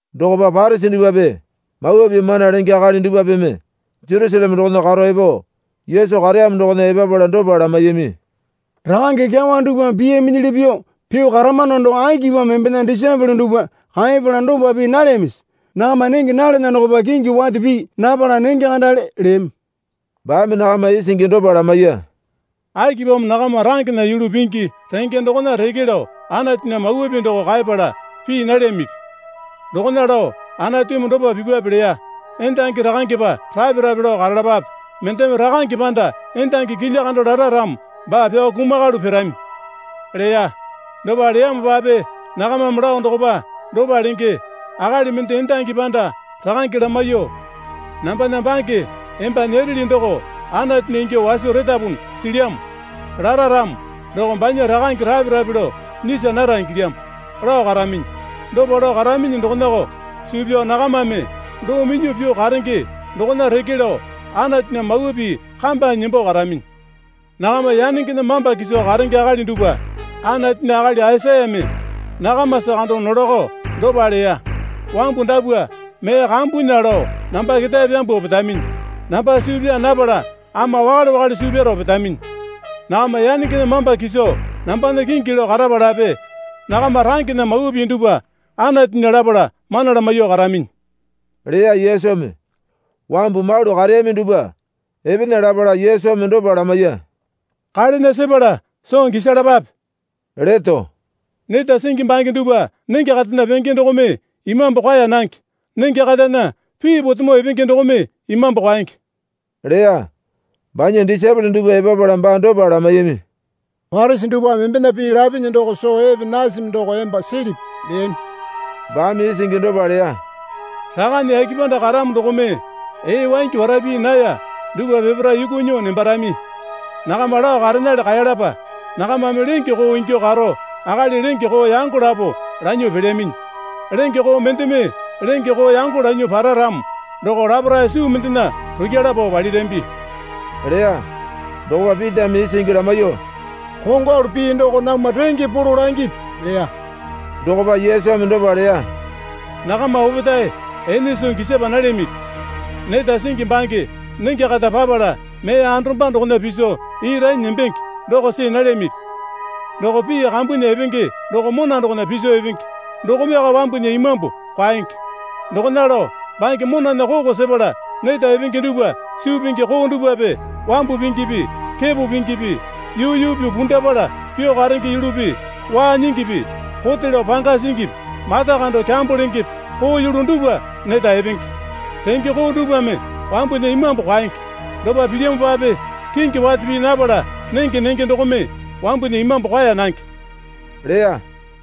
Dokopa Parisi dupwape Mawa Pii mana lenge akali dupwapeme Jerusaleme dokona karo epo Yesu kareyamo dokona epapala dopa lamaiyami. Rakange kyawa dupwame piyaminyili pyuo pyuo karamano doko akipamo embena disaepole dupwa kaepala dopa pii nalyamisi? Nakama nenge nalana dokopa kingi wate pii napala nenge kandale, leyami. Baame nakama isingi dopa lamaiya. Akipamo nakama rangena yulu pingi renge dokona reke lao Anatunya mawa pii doko kaepala pii nalyamipi? Dokona lao Anatumi dopa pipwape leya. Endangi rakangepa rape rape lao karalapape. Mendeme rakange panda endangi kilya kando lara ramo baa pyao kumakalu pirami, leya. Dopa leyamopape nakamame lao dokopa dopa lenge. Akali mende endangi panda rakange lamaiyuo, Nambana bange emba nyereli doko Anatunya ingyuo waso retapunu silyamo, lara ramo doko banya rakange rape rape lao nyisa nara ingilyamo, lao karaminyi. Dopa lao karaminyi dokonako suu pyao nakamame doo minyuo pyuo karenge dokona reke lao Anatunya mawa pii kambanyi nembo karaminyi. Nakama yanengena mamba kiso karenge akali dupwa Anatunya akali Aisayame nakamasa kando nolako dopa leya. Wambu dapwa mee kambunya lao namba ketae pyambuo petaminyi. Namba suu pyaa napala ama wakale wakale suu pyaro petaminyi. Nakama yanengena mamba kiso nambana kingi lao karapalape nakama rangena mawa pii dupwa Anatunya lapala mana lamaiyuo karaminyi, leya Yesumi. Wambu malu kareyami dupwa epena lapala Yesumi dopa lamaiya. Kalena sepala soo gisalapape, leto. Neta singi bange dupwa nenge katana penge dokome imambu kwaeya nange. Nenge katana pii potemo epenge dokome imambu kwaenge, leya. Banya disaepole dupwa epapala baa dopa lamaiyami. Parisi dupwame embena pii lapinyi doko soo epe nasami doko emba silipi? leyami. Baame isingi dopa leya. Rakane yake panda karamo dokome ee waingi wara pii naya dupwa peparae yuku nyuo nembarami. Nakama lao karenale kaeyalapa. Nakamame lenge koo ingyuo karo akali lenge koo yango lapo lanyuo pelyaminyi. Lenge koo mendeme lenge koo yango lanyuo para ramo doko laparae suu mendena rukyala pao palirambi leya. Dokopa Pitame isingi lamaiyuo, Kongwalu pii doko namwa renge polo langipi, leya. Dokopa Yesumi dopa leya. Nakama opetae ene soo gisapa nalyamipi? Neta singi bange nenge kata papala mee andoromba dokona piso ii ranyi nembenge doko see nalyamipi? Doko pii kambunya epenge doko mona dokona piso epenge dokomeko wambunya imambu kwaenge. Dokona lao bange monana koko sepala neta epenge dupwa suu pingi koo dupwape wambu pingipi kepo pingipi yuu yuu pyuo pundapala pyuo karenge yulupi waa nyingipi kote lao panga singipi mata kando kyambo lengepe koo yulu dupwa neta epenge. Renge koo dupwame wambunya imambu kwaenge. Dopa pilyamopape kingi wate pii napala nenge nenge dokome wambunya imambu kwaeya nange, leya.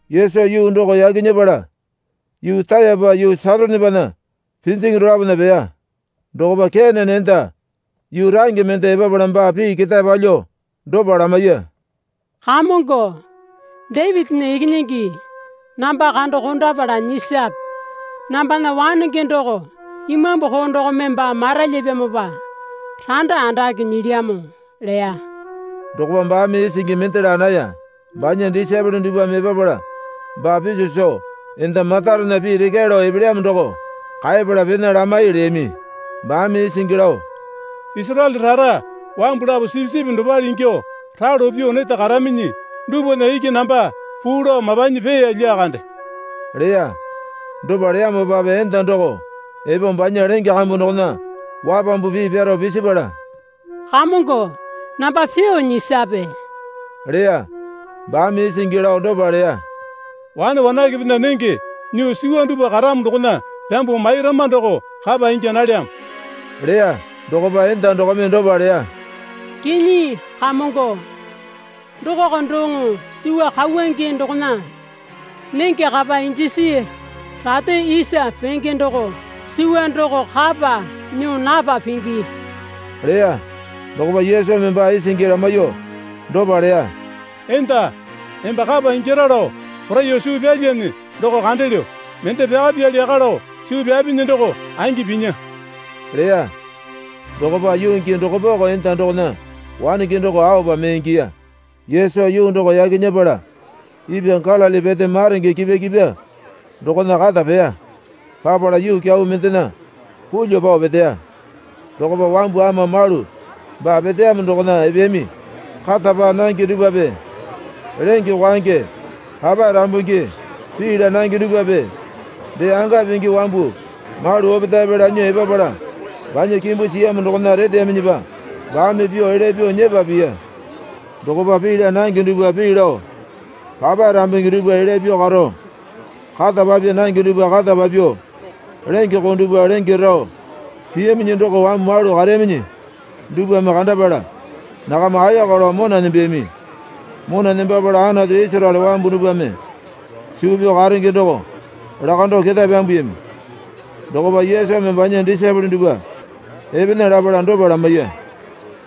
Yesu yuu doko yaki nyepala yuu Rayapa yuu Saitonepana pinjingi dolapona peya. Dokopa Kenane enda yuu range mende epapala baa pii ketae palyuo dopa lamaiya. Kamongo, Dapitinya Ikinyingi, namba kando kondapala nyisape. Nambana wanenge doko imambu koo dokome baa maralyapyamopa randa andake nyilyamo, leya. Dokopa baame isingi mende laa naya. Banya disaepole dupwame epapala baa piso soo, Enda matarena pii rekyae lao epelyamo doko kaepala pena lamai, leyami. Baame isingi lao, Isaraele rara wambu lapo sipisipi dopale ingyuo ralo pyuo neta karaminyi dupwana iki namba puu lao mapanyi peeya lyakande, leya. Dopa leyamopape enda doko epo banya lenge kambu dokona wapambu pii pyaro pisipala, Kamongo, namba pyuo nyisape, leya. Baame isingi lao dopa leya. Wane wanakepena nenge nyuo suwa dupwa karamo dokona pyambuo mairama doko kapa ingya nalyamo, leya. Dokopa enda dokome dopa leya. Kinyi, Kamongo, dokoko doŋo suwa kauwange dokona nenge kapa injisi rate isa penge doko suwa doko kapa nyuo napa pingi leya. Dokopa Yesumi baa isingi lamaiyuo dopa leya. Enda, emba kapa ingyara lao poraiyuo suu pyalyane doko kandelyo. Mende pyakapyali yaka lao suu pyapinyi doko angi pinya, leya. Dokopa yuu gii dokopako enda dokona wanenge doko aopa mee ingiya. Yesu yuu doko yaki nyepala ipwa Galili pete maronge kipwa kipwa dokona kata peya. Papala yuu kyau mendena pulyuo pao peteya. Dokopa wambu ama malu baa peteyamo dokona epeyami. Kata paa nange dupwape lenge kwaenge papae rambungi pii laa nange dupwape dee anga pingi wambu malu opetaepe lanyuo epapala banya kimbu siyamo dokona reteyaminyipa baame pyuo elya pyuo nyepa piya. Dokopa pii laa nange dupwa pii lao, papae rambungi dupwa elya pyuo karo, kata papya nange dupwa kata papyuo, lenge koo dupwa lenge rao piyaminyi doko wambu malu kareyaminyi dupwame kandapala nakama ayaka lao mona nembeyami. Mona nembapala Anatu Isaraele wambu dupwame suu pyao karenge doko lakando ketae pyambuyami. Dokopa Yesumi banya disaepole dupwa epena lapala dopa lamaiya.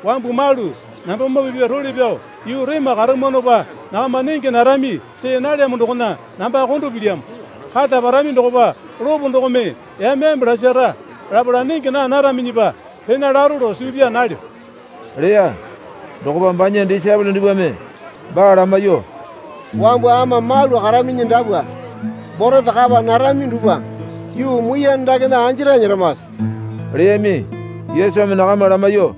Wambu malu nambamoo pipya role pyao yuu rema karamwanopa nakama nenge narami see nalyamo dokona namba kondo pilyamo. Kata parami dokopa lopo dokome yame yame lasara lapala nenge naa naraminyipa pena laro lao suu pyaa nalyo, leya. Dokopa banya disaepole dupwame baa lamaiyuo, Wambu ama malu karaminyi dapwa borete kapa narami dupwa yuu muiyane dakena anjarae nyeramase? leyami. Yesumi nakama lamaiyuo,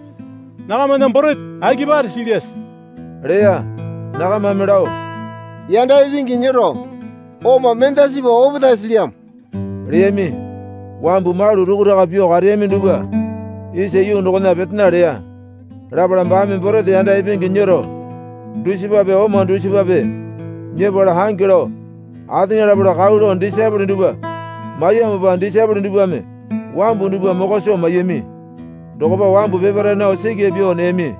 Nakamana borete akipare silyase? leya. Nakamame lao, Yanda ipingi nyero oma mendasipa opetae silyamo, leyami. Wambu malu rukuraka pyuo kareyami dupwa isa yuu dokona petena leya. Lapala baame borete yanda ipingi nyero dusipape oma dusipape nyepala ange lao ateŋa lapala kau lao disaepole dupwa maiyamopa disaepole dupwame wambu dupwa mokwa soo maiyami. Dokopa wambu peparae nao sikya pyuo neyami.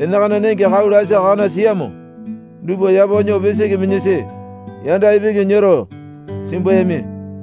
Enakana nenge kau lasi kakana siyamo dupwa yapo nyuo pisiki minyasi yanda ipingi nyero simbuyami.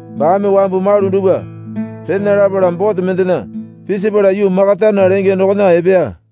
Baame wambu malu dupwa pena lapala bote mendena pisipala yuu Makatana lenge dokona epeya.